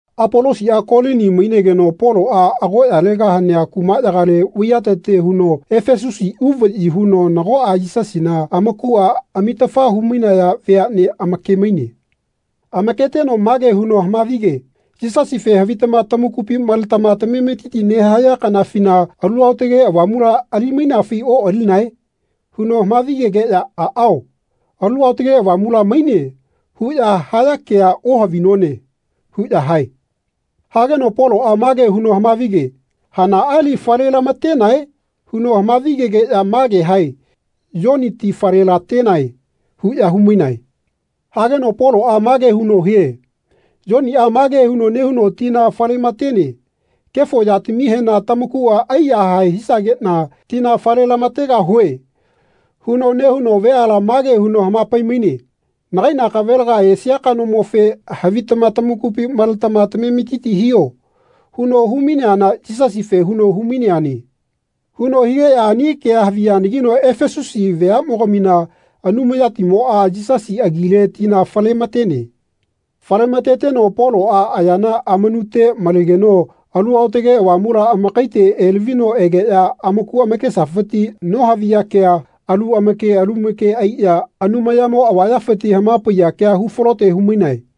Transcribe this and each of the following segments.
Apolosiꞌa Kolini mainegeno Poloꞌa agoꞌyalega hanea kumaꞌyagale vaiyatete huno Efesusi uvaꞌyi huno nagoꞌa Yisasina amakuꞌa amitafa humainaya veaꞌnea amake-maine. Amaketeno mage huno hamavike “Yisasife havitama tamakupi maletama tamametiti nehaya kanafina Alu Aotage Avamula ali-mainafi oꞌalinae?” huno hamavigegeꞌya “Aꞌao, ‘Alu Aotage Avamula maine.’ huꞌya haya kea ohavinone.” huꞌya hae. Hageno Poloꞌa mage huno hamavige “Hanaꞌa li falelamatenae?” huno hamavigegeꞌya mage hae “Yoni ti falelatenae.” huꞌya humainae. Hageno Poloꞌa mage huno hie “Yoniꞌa mage nehuno tina falematene ‘Kefo yatamihena tamakuꞌa aiyahae hisageꞌna tina fale-lamategahue.’ huno nehuno veala mage huno hamapai-maine ‘Nagai nakavelaga esia kanomofe, havitama tamakupi maletama tametiti hiho.’ huno humaineana Yisasife huno humaineane.” Huno higeꞌya ani kea haviyanagino Efesusi veaꞌmogamina Anumayatimoꞌa Yisasi agile tina falematene. Fale-mateteno Poloꞌa ayana amanute malegeno Alu Aotage Avamula amakaite elavino egeꞌya amaku amakesafiti nohaviya kea, alu amake alu amake aiꞌya Anumayamo avayafiti hamapaiya kea hufalote humainae.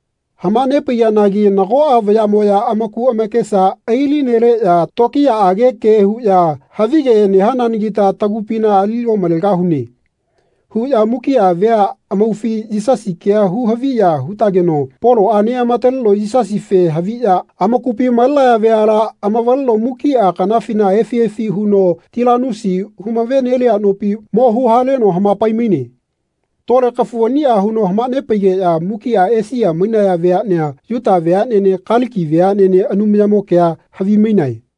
Hamanepaiyanagi nagoꞌa vayaꞌmoꞌya amaku amakesa ailineleꞌya tokiyaꞌage ke huꞌya “Havige nehananagita tagupina ali omalegahune.” huꞌya mukiꞌa vea amaufi Yisasi kea hu-haviya hutageno Poloꞌa neꞌamataleno Yisasife haviꞌya amakupi malenaya veala amavaleno mukiꞌa kanafina efi efi huno Tilanusi humavenelia nopi mo huhaleno hamapai-maine. Tole kafu aniꞌa huno hamanepaigeꞌya mukiꞌa Esia mainaya veaꞌnea Yuta veaꞌnene Kaliki veaꞌnene Anumayamo kea havimainae.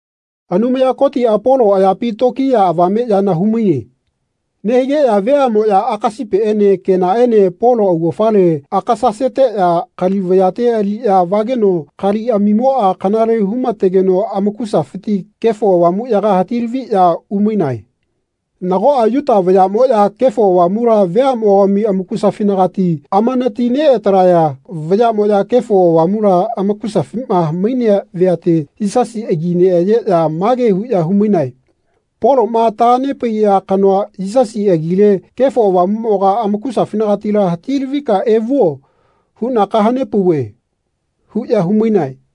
Anumaya Kotiꞌa Polo ayapi tokiya avame yana humaine. Nehigeꞌya veaꞌmoꞌya akasipiene kenaene Polo augafale akasaseteꞌya kali vayate aliꞌya vageno kaliꞌamimoꞌa kanale humategeno amakusafiti Kefo Avamuꞌyaga hati-laviꞌya umainae. Nagoꞌa Yuta vayaꞌmoꞌya Kefo Avamula veaꞌmogami amakusafinagati amanati neꞌatalaya vayaꞌmoꞌya Kefo Avamula amakusafima mainea veate Yisasi agi neꞌayeꞌya mage huꞌya humainae “Poloꞌma tahanepaiya kanoa, Yisasi, agile Kefo Avamuꞌmoga amakusafinagatila hati-lavika evuo huꞌna kahanepauve.” huꞌya humainae.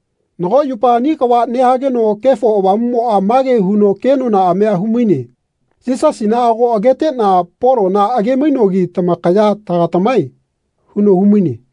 Nago yupa ani kava nehageno Kefo Avamuꞌmoꞌa mage huno kenonaꞌamia humaine “Yisasina ago ageteꞌna Polona age-mainogi tamakaya tagatamae?” huno humaine.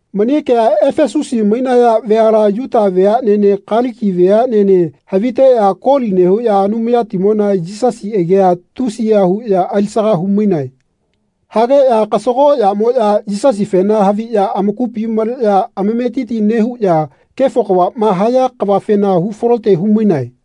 Mani kea Efesusi mainaya veala Yuta veaꞌnene Kaliki veaꞌnene haviteꞌya koli nehuꞌya Anumayatimona Yisasi agia tusiya huꞌya alisaga humainae. Hageꞌya kasagoꞌyamoꞌya Yisasifena haviꞌya amakupi maleꞌya amametiti nehuꞌya kefo kavaꞌma haya kavafena hufalote humainae.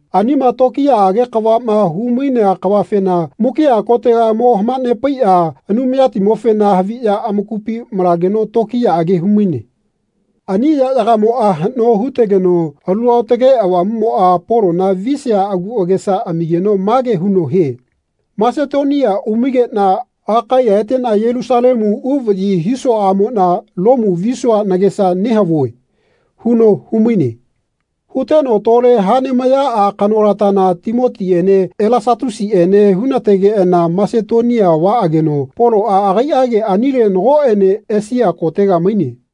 Anima tokiyaꞌage kavaꞌma humainea kavafena mukiꞌa kotega mo hamanepaiꞌya Anumayamofena haviꞌya amakupi malageno tokiyaꞌage humaine. Ani yaꞌyagamoꞌa haꞌno hutegeno Alu Aotage Avamuꞌmoꞌa Polona visia agu agesa amigeno mage huno hie “Masetonia umaigeꞌna Akaiya eteꞌna Yelusalemu uvaꞌyi hisuaꞌamoꞌna Lomu visua nagesa nehavue.” huno humaine. Huteno tole haꞌnemayaꞌa kanolatana Timotiꞌene Elasatusiꞌene hunategeꞌana Masetonia vaꞌageno Poloꞌa agaiꞌage anile nagoꞌene Esia kotega maine.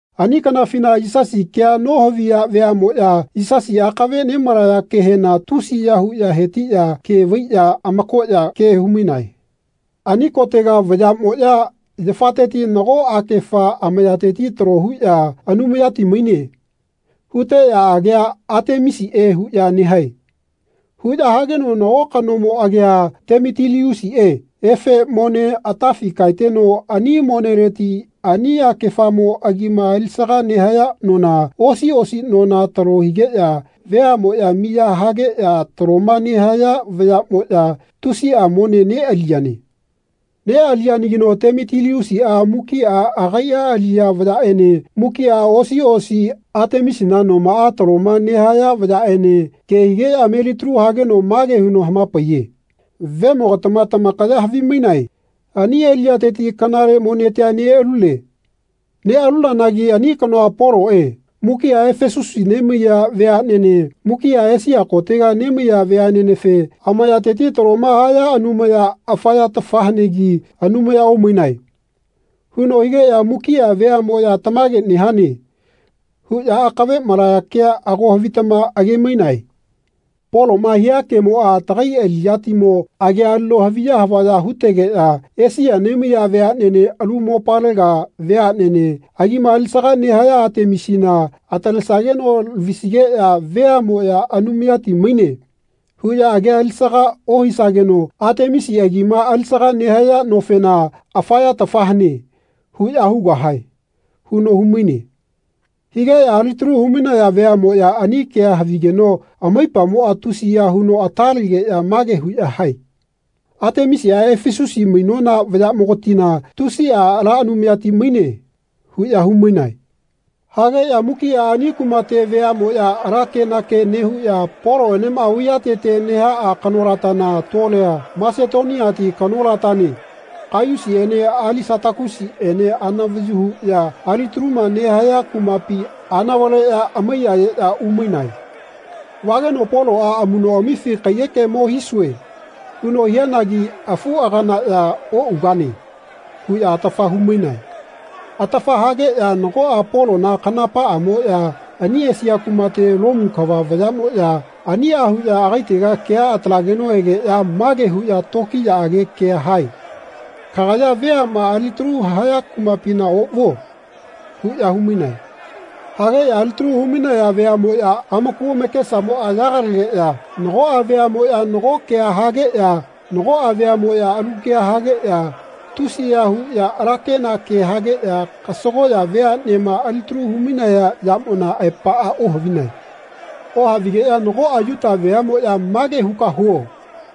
Ani kanafina Yisasi kea nohaviya veaꞌmoꞌya Yisasi akave nemalaya kehena tusiya huꞌya hetiꞌya ke vaiꞌya amakoꞌya ke humainae. Ani kotega vayaꞌmoꞌya yafateti nago akefa amayateti talo huꞌya “Anumayati maine.” huteꞌya agia Atemisiꞌe huꞌya nehae. Huꞌya hageno nago kanomo agia Temitiliusiꞌe efe mone atafi kaeteno ani moneleti ani akefamo agima alisaga nehaya nona, osi osi nona talo higeꞌya veaꞌmoꞌya miya hageꞌya taloma nehaya vayaꞌmoꞌya tusiꞌa mone neꞌaliyane. Neꞌaliyanagino Temitiliusiꞌa mukiꞌa agaiꞌa aliꞌya vayaꞌene mukiꞌa osi osi Atemisina nomaꞌa taloma nehaya vayaꞌene ke higeꞌya melitalu hageno mage huno hama-paiye “Vemogatama tamakaya havimainae ani aliꞌyateti kanale monetia neꞌalune. Neꞌalunanagi ani kanoa, Poloꞌe, mukiꞌa Efesusi nemaiya veaꞌnene mukiꞌa Esia kotega nemaiya veaꞌnenefe ‘Amayateti taloma haya anumaya afa yatafa hanegi Anumaya omainae.’ huno higeꞌya mukiꞌa veaꞌmoꞌya ‘Tamage nehane.’ huꞌya akave malaya kea ago havitama age-mainae. Poloꞌma hia kemoꞌa tagai aliꞌyatimo agia alino haviya havaya hutegeꞌya Esia nemaiya veaꞌnene alu mopalega veaꞌnene agima alisaga nehaya Atemisina atalesageno lavisigeꞌya veaꞌmoꞌya ‘Anumayati maine.’ huꞌya agia alisaga ohisageno Atemisi agima alisaga nehaya nofena ‘Afa yatafa hane.’ huꞌya hugahae.” huno humaine. Higeꞌya alitalu humainaya veaꞌmoꞌya ani kea havigeno amaipamoꞌa tusiya huno ata legeꞌya mage huꞌya hae “Atemisiꞌa Efesusi mainona vayaꞌmogatina tusiꞌa ala anumayati maine.” huꞌya humainae. Hageꞌya mukiꞌa ani kumate veaꞌmoꞌya ala kenake nehuꞌya Poloꞌenema vaiyatete nehaꞌa kanolatana tolea Masetoniati kanolatane Kaiyusiꞌene Alisatakusiꞌene anavayu huꞌya alitaluma nehaya kumapi anavaleꞌya amaiyayeꞌya umainae. Vageno Poloꞌa “Amuꞌnoꞌamifi kaiyeke mo hisue.” huno hianagi afuꞌaganaꞌya “Oꞌugane.” huꞌya atafa humainae. Atafa hageꞌya nagoꞌa Polona kanapaꞌamoꞌya ani Esia kumate Lomu kava vayaꞌmoꞌya aniꞌa huꞌya agaitega kea atalageno egeꞌya mage huꞌya tokiyaꞌage kea hae “Kagaya veaꞌma alitalu haya kumapina oꞌvuo.” huꞌya humainae. Hageꞌya alitalu humainaya veaꞌmoꞌya amaku amakesamoꞌa yagalegeꞌya nagoꞌa veaꞌmoꞌya nago kea hageꞌya nagoꞌa veaꞌmoꞌya alu kea hageꞌya tusiya huꞌya ala kenakea hageꞌya kasagoꞌya veaꞌnema alitalu humainaya yamona aepaꞌa ohavinae. Ohavigeꞌya nagoꞌa Yuta veaꞌmoꞌya “Mage huka huo.”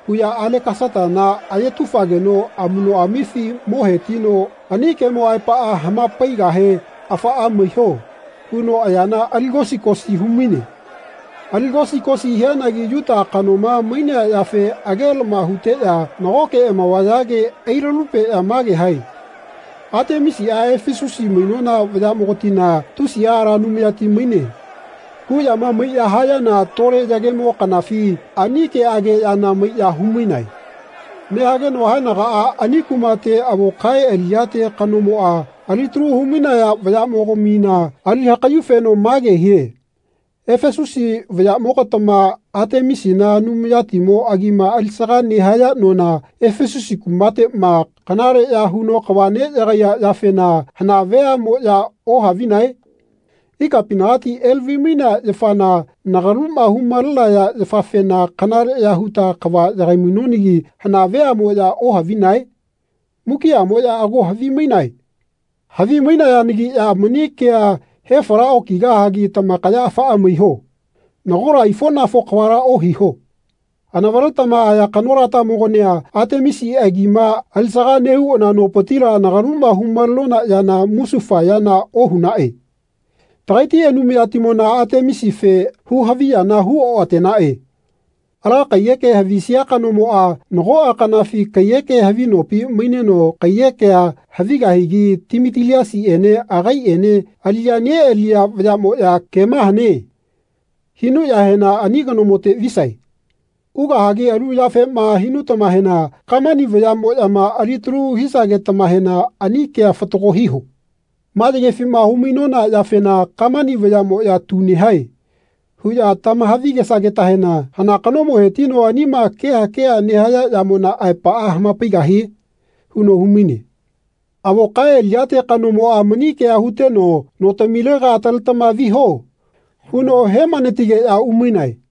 huꞌya Alekasatana ayetufageno amuꞌnoꞌamifi mo hetino ani kemo aepaꞌa hamapaigahe “Afaꞌa maiho.” huno ayana aligosi-gosi humaine. Aligosi-gosi hianagi Yuta kanoma mainea yafe agelama huteꞌya nagoke amavayage ailalupeꞌya mage hae “Atemisiꞌa Efesusi mainona vayaꞌmogatina tusiꞌa ala anumayati maine.” huꞌyama maiꞌya hayana tole yagemo kanafi ani keꞌageꞌyana maiꞌya humainae. Nehageno haenagaꞌa ani kumate avo kae aliꞌyate kanomoꞌa alitalu humainaya vayaꞌmogamina ali hakaꞌyufeno mage hie “Efesusi vayaꞌmogatama Atemisina anumayatimo agima alisaga nehaya nona Efesusi kumateꞌma kanaleꞌya huno kava neꞌyagaiya yafena hana veaꞌmoꞌya ohavinae? Ikapinagati elavi-mainea yafana nagaluma humalenaya yafafena kanaleꞌya huta kava yagai-mainonagi hana veaꞌmoꞌya ohavinae? Mukiꞌamoꞌya ago havimainae. Havimainayanagiꞌya mani kea hefala okigahagi tamakaya afaꞌa maiho. Nagola aifoꞌnafo kavala ohiho. Anavaletama aya kanolatamogania Atemisi agima alisaga nehuna nopitila nagaluma humalenona yana musufa yana ohunaꞌe. Tagaiti anumayatimona Atemisife huhaviyana hu-oꞌatenaꞌe. Ala kaiyeke havisia kanomoꞌa nagoꞌa kanafi kaiyeke havi nopi maineno kaiyekea havigahigi Timitiliasiꞌene agaiꞌene aliꞌya neꞌaliya vayaꞌmoꞌya ‘Kema hane.’ hinuꞌyahena ani kanomote visae. Ugahagi alu yafema hinutamahena kamani vayaꞌmoꞌyama alitalu hisagetamahena ani kea fatago hiho. Ma yagefima hu-mainona yafena kamani vayaꞌmoꞌya ‘Tu nehae.’ huꞌya tahavigesagetahena hana kanomo hetino anima keha keha nehaya yamona aepaꞌa hamapaigahie?” huno humaine. Avo kae aliꞌyate kanomoꞌa mani kea huteno “Notamilega ataletama viho.” huno hemanatigeꞌya umainae.